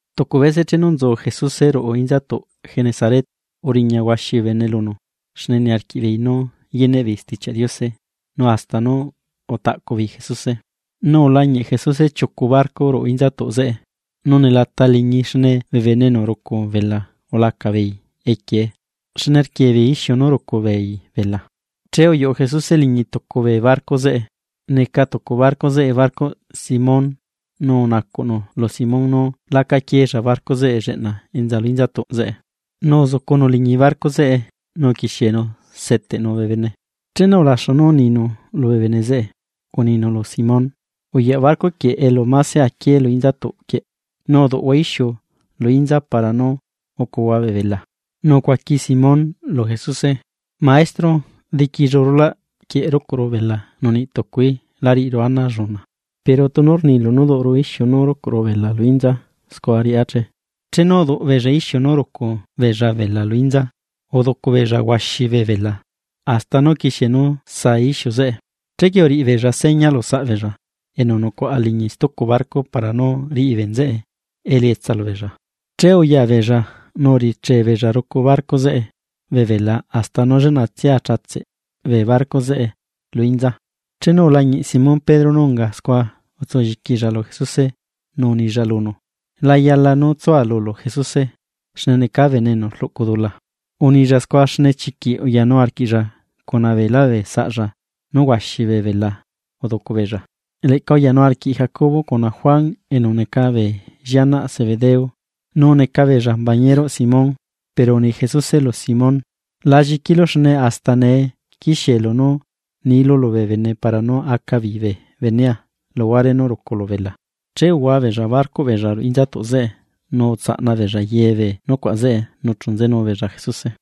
Tucu bese chenu nzu Jesuse ruꞌu inzatuꞌ Genesaret, uriña huaxi bee bene lunu xne niarquiꞌ beei nú yeneꞌ beei Stichiaꞌ Diose nu hasta nú utaꞌcu beei Jesuse. Nu ulañiꞌ Jesuse chiucu barco ruꞌu inzatuꞌ zeꞌe. Nu nelata liñii xne bee bene enu rucu bela ulacala beei equiee xne rquie beei ixiu nú rucu beei bela. Che uyuꞌu Jesuse liñi tucu bee barco zeꞌe, neca tucu barco zeꞌe barcoꞌ Simón, nu unacuꞌnu lu Simón nú laca quieella barco zeꞌe lleꞌna enza lu inzatuꞌ zeꞌe. Nu uzucunu liñi barco zeꞌe nu uquiexienu seteꞌnu bee bene. Chenu ulaxu nú uninu lubee bene zeꞌe, uninu lu Simón: ―Uyaꞌ barco quieꞌ elu mase aquié lu inzatuꞌ quieꞌ, nu duꞌhua ixiu lu inza para nú ucuhua bee bela. Nu ucuaqui Simón lu Jesuse: ―Maestro, diquillu rulaꞌ quieꞌ rucuꞌru bela nu niꞌ tucuí lá riꞌiru ana alluna, pero tunu rnilu nú duꞌuru ixiu nú rucuꞌru bela lu inza scua riꞌá che. Chenu uduꞌ beella ixiu nú rucu beella bela lu inza, uducu beella huaxi bee bela hasta nú uquixie nú saa ixiu zeꞌe. Chequie uriꞌi beella seña lu saꞌ beella enu nucuaꞌa liñi stucu barco, para nú riꞌi bee nzeꞌe elietsa lubeella. Che uya beella nu urichee beella rucu barco zeꞌe bee bela hasta nú lleꞌnatsia achatseꞌ bee barco zeꞌe lu inza. Chenu ulañiꞌ Simón Pedro nú unga scua utsu lliquilla lu Jesuse nu unilla lunu: ―¡La yala nú tsua lulu Jesuse, xne necaa bene enu rluꞌcu dula! Unilla scua xne chiquiꞌ uyanu arquiꞌlla cuna beelá bee saꞌlla nú huaxi bee bela uducu beella. Leꞌca uyanu arquiꞌ Jacobo cuna Juan, enu neca bee llianaꞌ Zebedeo, nu neca beella mbañeruꞌ Simón. Pero uni Jesuse lu Simón: ―La lliquilu xne hasta nee quixiélu nú nilu lubee bene para nú aca beei bee benea luhuare nú ruculu bela. Che uhua beella barcoꞌ beella ruꞌu inzatuꞌ zeꞌe, nu utsaꞌna beella ye bee nucuaꞌ zeꞌe nu chu nzenu beella Jesuse.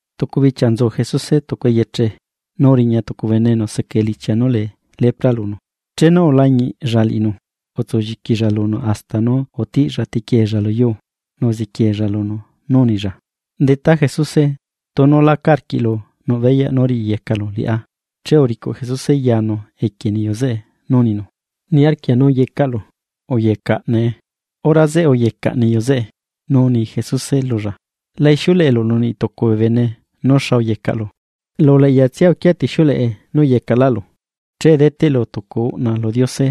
Tucu bichia nzu Jesuse tucu eyeche, nu uriña tucu bene enu seca elichia nú lee lepra lunu, chenu ulañiꞌlla liꞌinu, utsu lliquilla lunu hasta nú utiꞌlla tequieella lu yuu, nu uziquieella lunu nú unilla: ―Detá, Jesuse tunu laca arquiꞌlu nuꞌ beyaꞌ nú riꞌiyecalu liꞌá. Che uricuꞌ Jesuse yanu equie niyu zeꞌe, nu uninu: ―Niarquia nú yecaꞌlu. ¡Uyecaꞌ nee! Hora zeꞌe uyecaꞌ niyu zeꞌe. Nu uni Jesuse lulla: ―La ixiuleꞌelu lu niꞌtucu bee bene nú xa uyecaꞌlu, lu uleꞌyatsia uquia tixiuleꞌe nú uyecaꞌlaꞌlu. Che deteꞌlu tucu uꞌna lu Diose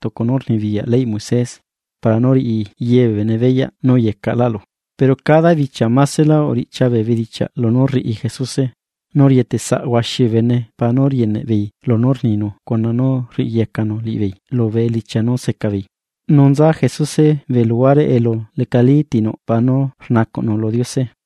tucu nú rnibiyaꞌ leyꞌ Moisés, para nú riꞌi ye bee bene beyaꞌ nú uyecaꞌlaꞌlu. Pero cada bichia masela uriꞌchia bee bedichiaꞌ lunú rriꞌi Jesuse, nu rieteꞌ saꞌ huaxi bee bene para nú rieneꞌ beei lunú rninu cuna nú rriꞌiyecanu liꞌibeei lubee elichia nú seca beei. Nu nza Jesuse bee luhuare elu lecalí ti nuꞌ para nú rnacuꞌnu lu Diose.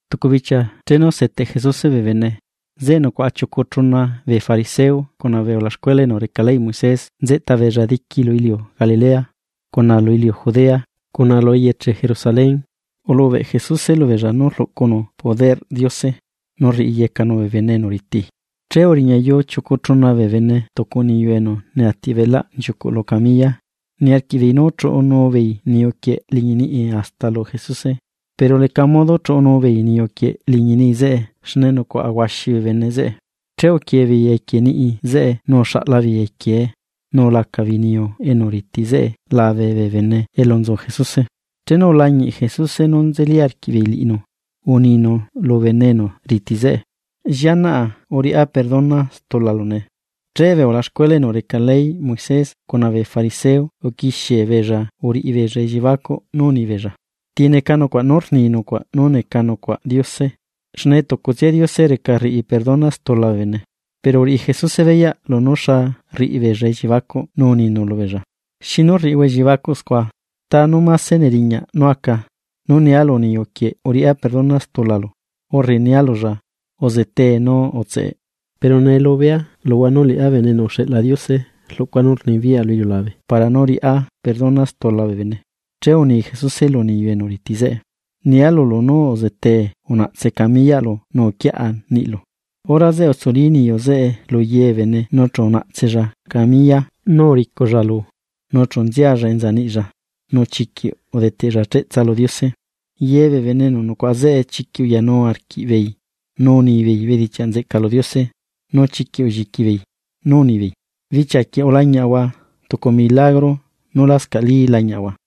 Tucu bichia chenu seteꞌ Jesuse bee bene, zeꞌe nucuaꞌa chiucu chuna bee fariseo cuna bee ulaxcuela enu reca leyꞌ Moisés nzeꞌta beella diqui lu iliu Galilea, cuna lu iliu Judea cuna lu eyeche Jerusalén. Ulubeꞌ Jesuse lubeella nú rlucuꞌnu poderꞌ Diose, nu rriyecanu bee bene enu riti. Che uriñayuu chiucu chuna bee bene tucu niyu enu neati beꞌlaꞌ nchiucuꞌ lu camilla, niarquiꞌ beei nú chuꞌunuu beei niyu quieꞌ liñi niꞌi hasta lu Jesuse. Pero leca modo chuꞌnuu beei niyu quieꞌ liñi niꞌi zeꞌe xne nucuaꞌa huaxi bee bene zeꞌe. Che uquie beei equie niꞌi zeꞌe nu uxaꞌla beei equiee, nu ulaca beei niyu enu riti zeꞌe labe bee bene elu nzu Jesuse. Chenu ulañiꞌ Jesuse nú nzeli arquiꞌbeei liꞌinu, uninu lu bene enu riti zeꞌe: ―Llianaꞌa uriꞌá perdona stulalu nee. Che bee ulaxcuela enu reca leyꞌ Moisés cuna bee fariseo uquixie beella uriꞌi beella elliebacuꞌ nú uni beella: “¿Ti neca nucuaꞌ nú rni nucuaꞌ nú neca nucuaꞌ Diose? Xne tucutsia Diose reca rriꞌi perdona stula bee bene.” Pero uriꞌi Jesuse beyaꞌ lunú xa rriꞌi beella elliebacuꞌ nu uninu lubeella: ―¿Xinu rriꞌihua elliebacuꞌ scua? ¿Ta nú mase neriñaꞌ nú aca: “Nú nia lu niyu quieꞌ uriꞌá perdona stulalu”, urre nia lulla: “Uzetee nu utseꞌ”? Pero nee lubea luhua nú liꞌá Bene enu uxeꞌla Diose rluꞌcua nú rnibiyaꞌa lu iliulabe para nú riꞌá perdona stula bee bene. Che uni Jesuse lu niyu enu riti zeꞌe: ―Nia lulu nú uzetee unaꞌtse camiyaꞌlu nu uquiaꞌa niꞌlu. Hora zeꞌe utsuli niyu zeꞌe lu ye bee bene nu chu unaꞌtsella camilla nú uriculla lu, nu chu nzialla enza niꞌlla nu chiquiꞌ udeteꞌlla cheꞌtsa lu Diose. Ye bee bene enu nucuaꞌa zeꞌe chiquiꞌ uyanu arquiꞌbeei nú unibeei bedichiaꞌ nzeꞌca lu Diose, nu chiquiꞌ ulliqui beei nú unibeei: ―Bichia quieꞌ ulañiaꞌahua tucu milagro nú lascaꞌ lañiaꞌahua.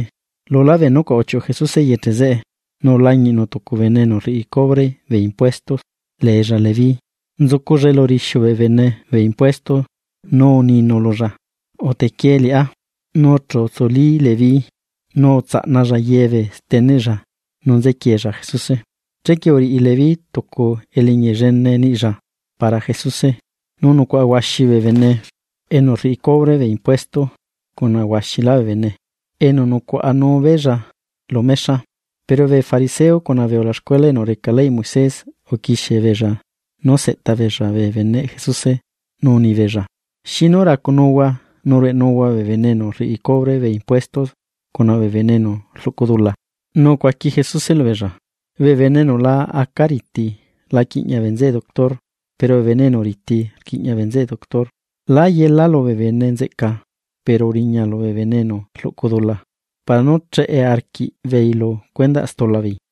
Lulá bee nucuaꞌ uchiuꞌu Jesuse eyeche zeꞌe, nu ulañiꞌnu tucu bene enu rriꞌi cubre bee impuesto leella Leví. Nzuculla elu rixiu bee bene bee impuesto. Nu uninu lulla: ―Utequie liꞌá. Nu chu utsuli Leví, nu utsaꞌnalla ye bee steneꞌlla nu nzequieella Jesuse. Chequie uriꞌi Leví tucu eliñi llene niꞌlla para Jesuse, nu nucuaꞌa huaxi bee bene enu rriꞌi cubre bee impuesto cuna huaxilá bee bene, enu nucuaꞌanu beella lu mexa. Pero bee fariseo cuna bee ulaxcuela enu reca leyꞌ Moisés, uquixie beella nú seꞌta beella bee beneꞌ Jesuse, nu uni beella: ―¿Xinu racunuhua nu rueꞌnuhua bee bene enu rriꞌi cubre bee impuesto cuna bee bene enu rluꞌcu dula? Nu ucuaqui Jesuse lubeella: ―Bee bene enu la aca riti la quiꞌña bee nzeꞌe doctor, pero bee bene enu riti rquiꞌña bee nzeꞌe doctor. Lá yela lubee bene nzeꞌca, pero uriña lubee bene enu rluꞌcu dula, para nú cheꞌe arquiꞌbeei lu cuendaꞌ stula beei.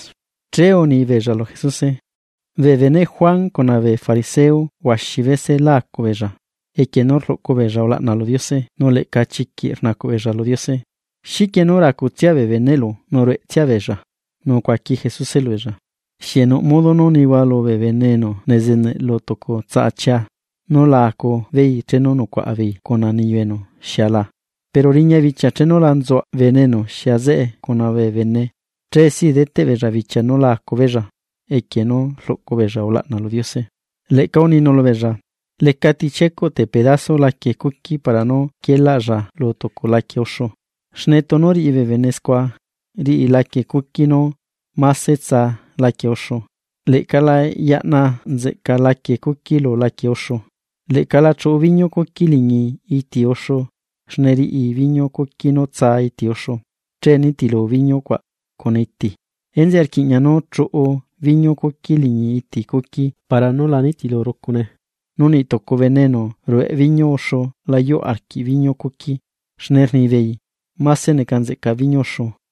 Che uni beella lu Jesuse: ―Bee beneꞌ Juan Bautista cuna bee fariseo huaxi bese lá acu beella, equie nú rluꞌcu beella ulaꞌna lu Diose nu leꞌca chiquiꞌ rnacuꞌ beella lu Diose. ¿Xiquie nú racutsia bee beneꞌlu nu rueꞌtsia beella? Nu ucuaqui Jesuse lubeella: ―¿Xieꞌ nuꞌ modo nú nihua lubee bene enu nezeneꞌ lu tucu tsaꞌa chia, nu la acu beei chenu nucuaꞌa beei cuna niyu enu xia la? Pero riña bichia chenu la nzuaꞌ bene enu xia zeꞌe cuna bee bene, che si deteꞌ beella bichia nú la acu beella, equie nú rluꞌcu beella ulaꞌna lu Diose. Leꞌca uninu lubeella: ―Lecati chiecuꞌ te pedazo laquie cuqui para nú quielaꞌlla lu tucu laquie uxu. Xne tunu riꞌi bee bene scua, riꞌi laquie cuqui nú mase tsaa laquie uxu, leꞌca la yaꞌna nzeꞌca laquie cuqui lu laquie uxu. Leꞌca la chuꞌu biñu cuqui liñi iti uxu, xne riꞌi biñu cuqui nú tsaa iti uxu, che nitilu biñu cuaꞌ cuna iti. Enzeꞌe rquiꞌña nú chuꞌu biñu cuqui liñi iti cuqui para nú la nitilu rucune. Nu niꞌ tucu bene enu rueꞌ biñu uxu la yuꞌ arquiꞌ biñu cuqui, xne rnibeei: “Máse neca nzeꞌca biñu uxu.”